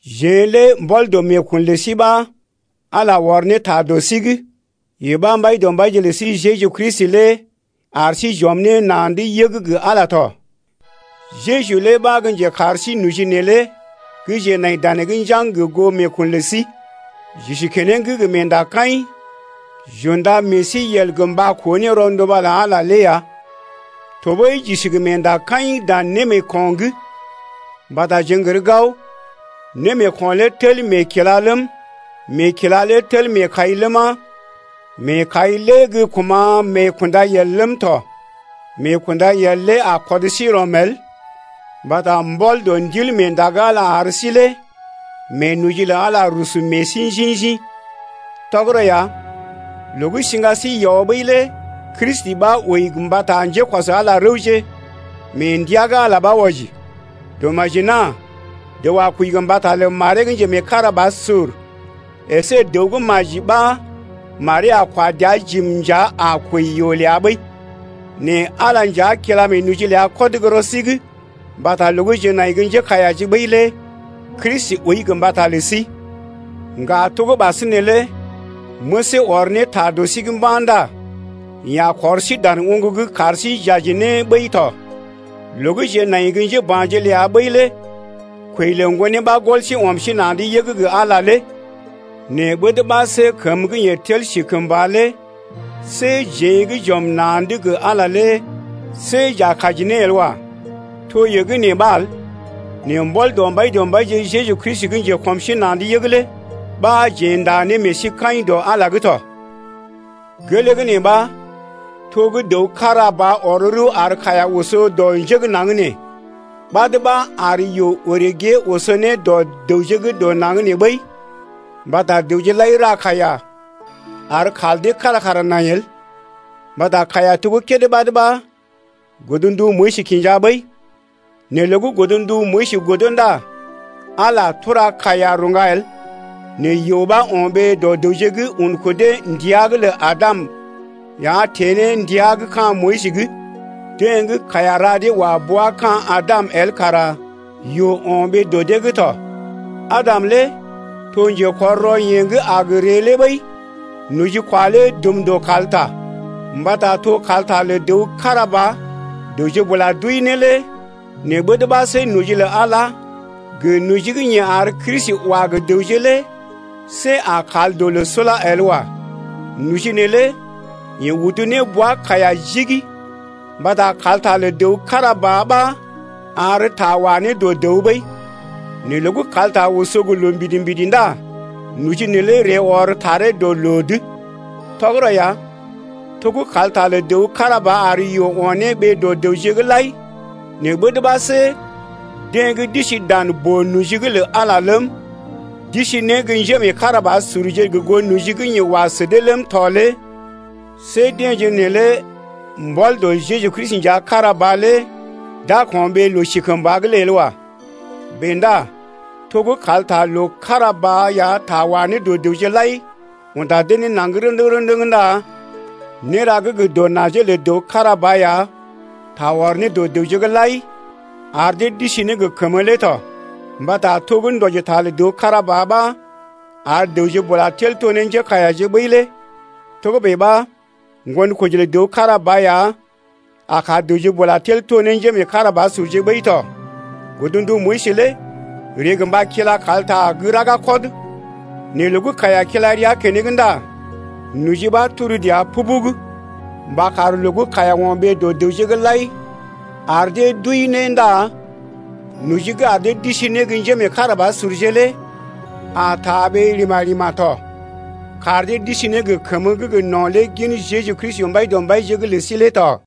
Jeḛ lé mbɔl dɔ meekun lə sí ɓa Ala ɔr ne ta dɔ sí’g yee ɓa Mbaidɔmbaije lə sí Jeju Kristi lé ar sí j’ɔm na̰’d yəg gə Ala tɔ. Jeju lé ɓa gə́ njekar sí noji neelé gə́ jeḛ nai danee’g njaŋg gə goo meekun lə sí. J’isi keneŋ gə meendakaḭ j’unda meḛ sí yel gə mba koo ne rɔnduba lə Ala lé ya. Tɔɓəi j’isi gə meendakaḭ dan némeeko̰’g mbata jeḛ n’gər gao némeeko̰ lé tel meekila ləm, meekila lé tel meekai ləma, meekai lé gə́ kuma̰ meekundayel ləm tɔ. Meekundayel lé a kɔd sí rɔm el mbata mbɔl dɔ Ndilmeenda gə́ Ala ar sí lé meenoji lə Ala rusu meḛ sí njḭ-njḭ. Tɔgərɔ ya, loo gə́ siŋga sí yɔ ɓəi lé Kristi ɓa wəi gə mbata njékɔs Ala rəwje mee ndəa gə́ Ala ɓa wɔji. Dɔmaji-nà dəw a kwəi gə mbata lə maree gə́ njemeekarabasur əsé dəw gə́ maji ɓa maree a kwa dəa jim nja a kwəi yoo ləa ɓəi. Nɛ Ala nja kila meenoji ləa kɔd gə́ rɔ sí’g mbata loo gə́ jeḛ nai gə́ njékaiyaje ɓəi lé Kristi wəi gə mbata lə sí. Ŋga to gə́ ɓasinè lé məsee ɔr ne ta dɔ sí’g mba̰ ndá yeḛ a kɔr sí dan oŋg’g kar sí j’aji ne ɓəi tɔ. Loo gə́ jeḛ nai gə́ njéba̰je ləa ɓəi lé kwəi lə Ŋgonee ɓa gɔl sí ɔm sí na̰’d yəg gə Ala lé nɛ ɓəd ɓa see kəmə gə́ yeḛ tel si kəmba lé see jeḛ gə́ j’ɔm na̰’d gə Ala lé see j’a kaji ne el wa. To yee gə́ nee ɓa el, nɛ mbɔl dɔ Mbaidɔmbaije Jeju Kristi gə́ njekɔm sí na̰’d yəg lé ɓa jeḛ ndá ne meḛ sí kaḭ dɔ Ala’g tɔ. Gelee gə́ nee ɓa to gə́ dəw kára ba ɔr rəw ar kaiya oso dɔ njé gə́ naŋg nee, ɓad ɓa ar yoo orè gée oso ne dɔ dəwje gə́ dɔ naŋg nee lai ɓəi mbata dəwje lai ra kaiya ar kal dee kára kara nai el. Mbata kaiya to kédé ɓad ɓa godndu Moyis kinja ɓəi. Nɛ loo gə́ godndu Moyis godo ndá Ala tura kaiya rṵga el. Nɛ yoo ɓa o̰ ɓee dɔ dəwje’g un kudee ndəa’g lə Adam ya teḛ ne ndəa gə́ ka̰ Moyis’g. Deḛ gə́ kaiya ra dee wa bea gə ka̰ Adam el kara yoo o̰ ɓee dɔ dee’g tɔ. Adam lé to njekɔr rɔ yeḛ gə́ a gə ree lé ɓəi. Nojikwa lé dum dɔ kalta, mbata to kalta lə dəw kára ba dəwje bula d’wəi ne lé nɛ ɓəd ɓa see noji lə Al, gə noji gə́ yeḛ ar Kristi wa gə dəwje lé see a kal dɔ loo sula el wa. Noji neelé yeḛ udu ne bwa kaiya jigi, mbata kalta lə dəw kára ba ɓa ar ta wa ne dɔ dəw ɓəi. Nɛ loo gə́ kalta oso gə loo mbidi-mbidi ndá noji neelé ree ɔr taree dɔ loo’d. Tɔgərɔ ya, to gə́ kalta lə dəw kára ba ar yoo o̰ ne ɓee dɔ dəwje’g lai, nɛ ɓəd ɓa see deḛ gə́ d’isi dan boo-noji’g lə Ala ləm, d’isi ne gə́ njémeekarabasurje gə goo noji gə́ yeḛ wa sə dee ləm tɔ lé see deḛje neelé mbɔl dɔ Jeju Kristi nja kára ba lé d’a ko̰ɓee loo sikəmba’g lé el wa. Bèe ndá to gə́ kalta gə́ loo kára ba ya ta wa ne dɔ dəwje lai unda dee ne naŋg rə̰dəŋ-rə̰dəŋ ndá néra gə́ gə dɔ najee lə dəw kára ba ya, ta ɔr ne dɔ dəwje’g lai ar dee d’isi ne gə kəmə lé tɔ. Mbata to gə́ ndɔjita lə dəw kára ba ɓa ar dəwje bula tel to ne njékaiyaje ɓəi lé togə́bè ɓa ŋgonkoji lə dəw kára ba ya a kar dəwje bula tel to ne njémeekarabasurje ɓəi tɔ. Godndu Moyis lé ree gə mba kila kalta gə́ raga kɔd, nɛ loo gə́ kaiya kila rəa keneŋ ndá noji ɓa turu dəa pubug mba kar loo gə́ kaiya o̰ ɓee dɔ dəwje’g lai ar dee d’wəi ne ndá noji gə́ ar dee d’isi ne gə́ njémeekarabasurje lé a taa ɓee rima-rima tɔ, kar dee d’isi ne gə kəmə gə́ gə no̰ lé gin Jeju Kristi, Mbaidɔmbaije’g lə sí lé tɔ.